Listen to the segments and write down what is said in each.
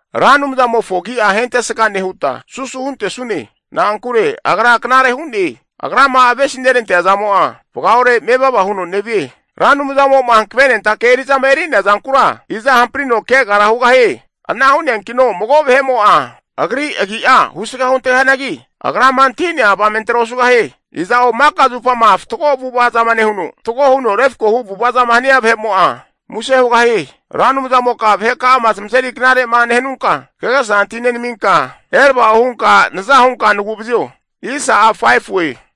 Ra Anumzamofo agi'a ahentesga nehuta susu huntesune. Na'ankure agra knare hu'ne. Agrama avesi nerantea zamo'a vagaore mevava huno nevie. Ra Anumzamo'ma hankavenentake eri'zama eri'nea zankura, iza hamprino kegara hugahie? Ana hu'neankino mago vahe'mo'a agri agi'a husga huntegahianagi, Agrama antahi'nea avamentera osugahie. Iza'o maka zupama fatgo avu'ava zama nehuno, fatgo huno refkohu avu'ava zama nehia vahe'mo'a muse hugahie. Ra Anumzamoka vaheka'ama zamazeri knare'ma nehanunka, kagesa antahi nenaminka, erava'o hunka naza hunka nagu'vazio.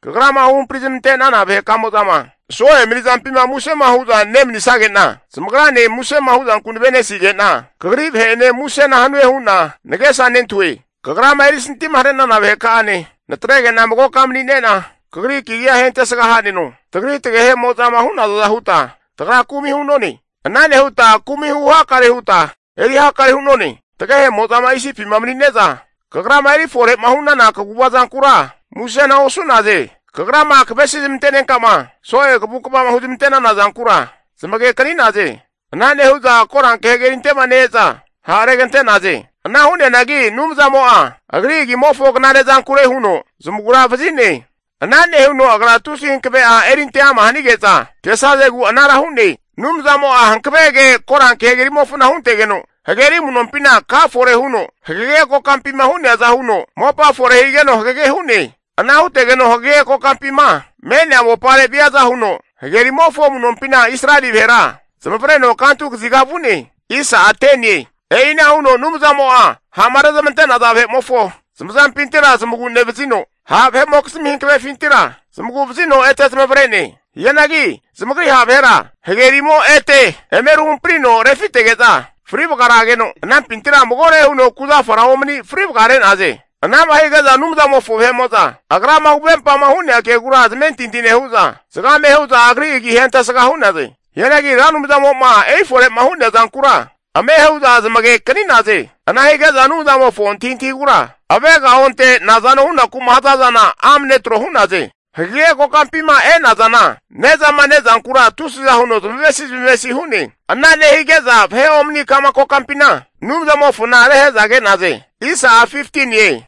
Kagrama huhampri zamante'nana vahe kamo'zama so'e mani'zampima musema hu'za nemanisage'na, zamagrane musema hu'zanku nave'nesige'na kagri vahe'ene musena hanue hu'na nagesa nentahue. Kagrama erisantima hare'nana vaheka'ane natrege'na magoka mani'ne'na, Kagri kagi'a ahentesga ha'neno. Tagri tagehe'mo'zama hu'nazaza huta tagra kumi hu'none. Ana nehuta kumi hu hakare huta eri hakare hu'none. Tagehemo'zama Isipima mani'neza kagrama eri fore'ma hu'nana kaguva zankura musena osu'naze. Kagrama kavesi zamantenenkama so'e kavukva'ma huzmante'nana zankura zamaganekani'naze. Ana nehu'za Koranke hagerinte'ma ne-eza ha' regante'naze. Ana hu'neanagi Anumzamo'a Agri agimofo knare zankure huno zamaguravazi'ne. Ana nehuno Agra tusi hankave'a erinte ama hanige'za kesazegu anara hu'ne. Anumzamo'a hankave ke Koranke Hagerimofona huntegeno, hageri amu'nompina ka fore huno, hagage kokampima hu'neaza huno mopa fore higeno hagege hu'ne. Ana hutegeno hagege kokampima me'nea mopare'ma viaza huno, hagerimofo amu'nompina Israeli vahera zamavareno kantu kaziga vu'ne. E'ina huno Anumzamo'a ha'ma rezmante'naza vahe'mofo zamazampintira zamagu'nevazino, ha' vahe'zmimokizmi hankavefintira zamagu'vazino ete zamavare'ne. Hianagi zamagri ha' vahera, hagerimo ete eme ruhamprino refitege'za fri vagarageno, anampintira magore huno kuzafara omani fri vagare'naze. Ana'ma hige'za Anumzamofo vahe'mo'za agrama huvempama hu'nea kegura zamentinti nehu'za, zagame hu'za agri agi ahentesga hu'naze. Hianagi Ra Anumzamo'ma erifore'ma hu'nea zankura, ame hu'za zamagekani'naze. Ana hige'za Anumzamofo antahintahigura avega onte'za nazano hunaku'ma haza zana, amne tro hu'naze. Hagege kokampima e'nazana ne'zama ne'zankura tusiza huno zamavesi zamavesi hu'ne. Ana nehige'za vahe omani ka'ma kokampina Anumzamofona rehe'za ke'naze.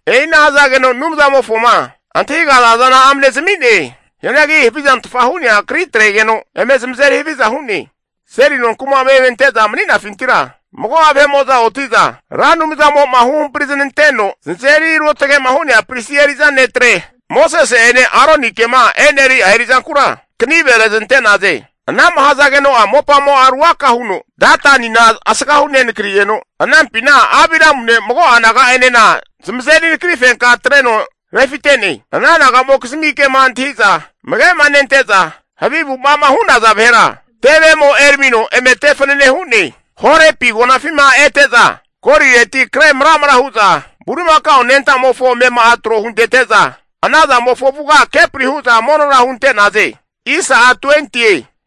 E'ina hazageno Anumzamofoma antahigaza zana amne zami'ne. Hianagi havizantfa hu'nea kri atregeno eme zamazeri haviza hu'ne. Seli nonkuma'ma eme ante'za mani'nafintira, mago'a oti'za Ra Anumzamo'ma huhampri zananteno zanazeri ruotagema hu'nea pristi eri'za netre Mosese'ene Aronikema e'neri'a eri'zankura kanive reznante'naze. Ana'ma hazageno'a mopamo'a ruaka huno Datanina asgahu nenakrino, anampina Abiramune mago'a naga'enena zamazeri nakrifenka atreno refite'ne. Ana naga'mokizmi kema antahi'za amage'ma nente'za vahe'mo'za havi avu'ava'ma hu'naza vahera, tevemo eramino eme te fanane hu'ne. Horepi agonafima ete'za golireti kre maramra hu'za, bulimakao anenta'mofo amema'a tro huntete'za, ana zamofo avuga kepri hu'za monora hunte'naze.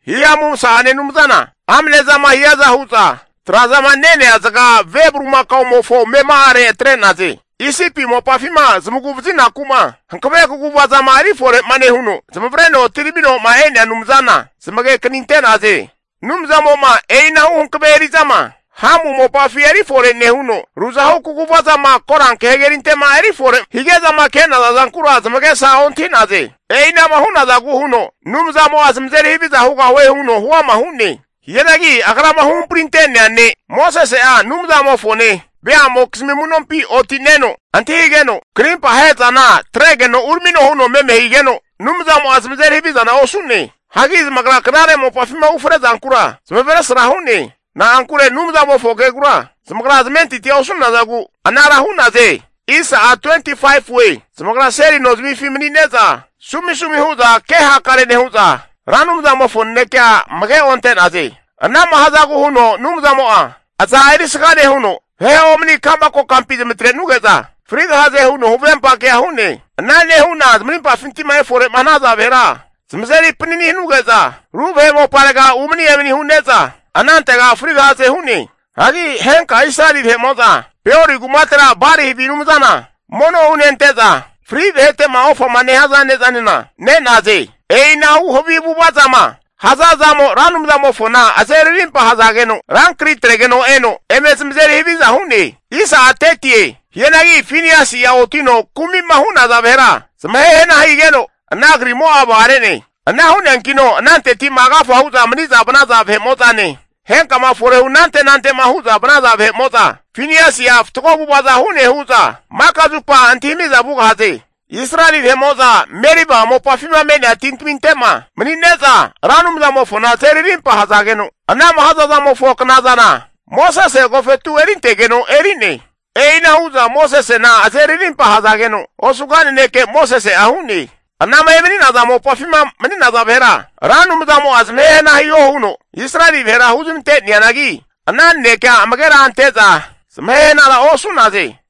Hihamu masa'ane Anumzana amne zama hiaza hu'za, tra'zama nenea zaga ve bulimakaomofo amema'are atre'naze. Isipi mopafima zamagu vazinaku'ma hankave kaguvazama erifore'ma nehuno, zamavareno etiramino'ma e'nea Anumzana, zamage kaninte'naze. Anumzamo'ma e'inahu hankave eri'zama Hamu mopafi erifore nehuno, ruzahu kaguvazama koranke hagerinte'ma erifore hige'zama ke'naza zankura zamagesa ontahi'naze. E'ina'ma hu'nazagu huno Anumzamo'a zamazeri haviza hugahue huno huama hu'ne. Hianagi Agrama huhamprinte'nea ne' Mosese'a Anumzamofone veamokizmi amu'nompi oti'neno antahigeno, krimpa ahe'zana atregeno uramino huno meme higeno, Anumzamo'a zamazeri havizana osu'ne. Hagi zamagra knare mopafima ufre zankura zamavesra hu'ne. Na'ankure Anumzamofo kegura zamagra zamentintia osu'nazagu anara hu'naze. Zamagra seli nozamifi mani'neza sumisumi hu'za kehakare nehu'za, Ra Anumzamofo nanekea amage onte'naze. Ana'ma hazagu huno Anumzamo'a aza erisga nehuno vahe omani ka'ma kokampi zamatre'nuge'za frigahaze huno huvempa kea hu'ne. Ana nehu'na zamagripinti'ma efore'ma hanaza vahera, zamazeri panani hanuge'za ru vahe moparega umani emani hu'ne'za anantega frigahaze hu'ne. Hagi henka Israeli vahe'mo'za Peori kumatera Bali havi anumzana mono hunente'za, fri vahete'ma ofama nehaza ne'zanena ne'naze. E'inahu havi avu'ava zama haza zamo Ra Anumzamofona azeri rimpa hazageno rankri atregeno eno, eme zamazeri haviza hu'ne. Hianagi Finiasi'a otino kumi'ma hu'naza vahera zamahe hana higeno, ana krimo'a vagare'ne. Ana hu'neankino ananteti'ma agafa hu'za mani'za vanaza vahe'mo'zane, henkama forehu anante nante'ma hu'za vanaza vahe'mo'za, Finiasi'a fatgo avu'ava'za hu'ne hu'za maka zupa antahimi'za vugahaze. Israeli vahe'mo'za Meriba mopafima me'nea tintaminte'ma mani'neza Ra Anumzamofona azeri rimpa ahazageno, ana'ma hazazamofo knazana Mosese agofetu erintegeno eri'ne. E'ina hu'za Mosesena azeri rimpa ahazageno, osuga naneke Mosese'a hu'ne. Anama emani'naza mopafima mani'naza vahera, Ra Anumzamo'a zamahe hana hiho huno Israeli vahera huzmante'neanagi, ana nanekea amagera ante'za zamahe hanara osu'naze.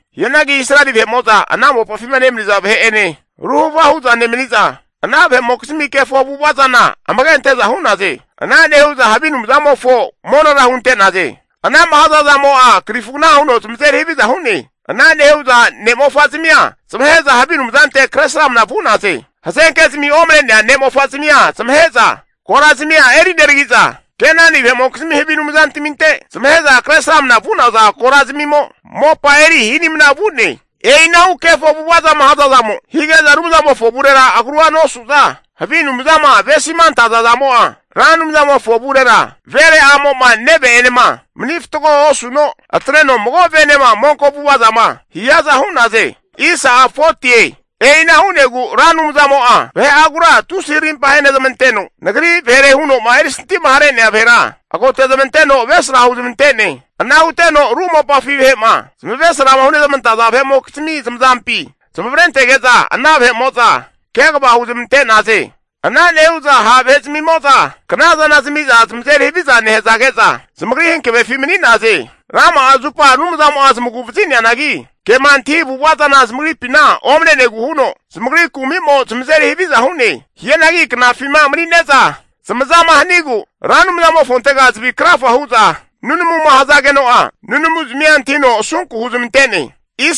Hianagi Israeli vahe'mo'za ana mopafima nemaniza vahe'ene ruhava hu'za nemani'za, ana vahe'mokizmi kefo avu'ava zana amage ante'za hu'naze. Ana nehu'za havi anumzamofo monora hunte'naze. Ana'ma haza zamo'a krifugna huno zamazeri haviza hu'ne. Ana nehu'za ne'mofa zamia zamahe'za havi anumzante kresramna vu'naze. Hazenkezmi omane'nea ne'mofa zamia zamahe'za, korazmia eri neragi'za, Kenani vahe'mokizmi havi anumzantaminte zamahe'za Kresramanama vu'naza korazmimo mopa eri hi'nimna vu'ne. E'inahu kefo avu'ava'ma hazazamo higeza Anumzamofo avurera agrua nosu'za, havi anumzama avesima antaza zamo'a Ra Anumzamofo avurera, vere a'mo'ma neve'enema mani fatgo osuno, atreno mago venema monko avu'ava zama hiaza hu'naze. E'ina hu'negu Ra Anumzamo'a vahe'agura tusi arimpa ahenezmanteno, nagri vahere huno'ma erisanti'ma hare'nea vahera agotezmanteno avesra huzmante'ne. Ana huteno ru mopafi vahe'ma zamavesrama hunezmantaza vahe'mokizmi zamazampi zamavarentege'za, ana vahe'mo'za kegava huzmante'naze. Ana nehu'za ha' vahe'zamimo'za knazana zamiza zamazeri haviza nehazage'za, zamagri hankavefi mani'naze. Rama'a zupa Anumzamo'a zamagu vazi'neanagi, kema antahi avu'ava zana zamagripina omane'negu huno, zamagri kumimo zamazeri haviza hu'ne. Hianagi knafima mani'neza zamazama hanigu Ra Anumzamofontega zavi krafa hu'za nunamuma hazageno'a, nunamuzamia antahino asunku huzmante'ne.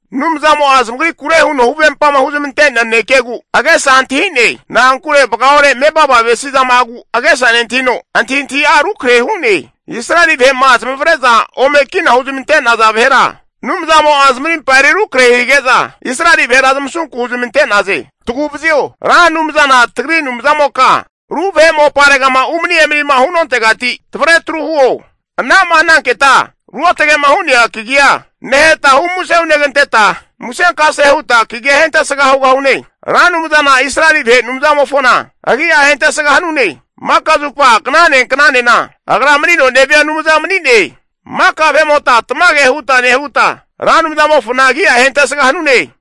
Anumzamo'a zamagrikure huno huvempama huzmante'nea nanekegu agesa antahi'ne. Na'ankure vaga ore mevava avesi zama'agu agesa nentahino, antahintahi'a rukrahe hu'ne. Israeli vahe'ma zamavare'za ome kina huzmante'naza vahera, Anumzamo'a zamarimpa eri rukrahe hige'za Israeli vahera zamasunku huzmante'naze. Taguvazio, Ra Anumzana tagri Anumzamoka ru vahe moparegama umani emanima hu'nontegati tavre atru huo. Ana'ma hananketa ruotage'ma hu'nea kagia neheta hu muse huneganteta, musenkase huta kagi'a ahentesga hugahune. Ra Anumzana Israeli vahe Anumzamofona agi'a ahentesga hanune. Maka zupa knane knanena agra manino nevia Anumza mani'ne. Maka vahe'mota tamage huta nehuta, Ra Anumzamofona agi'a ahentesga hanune.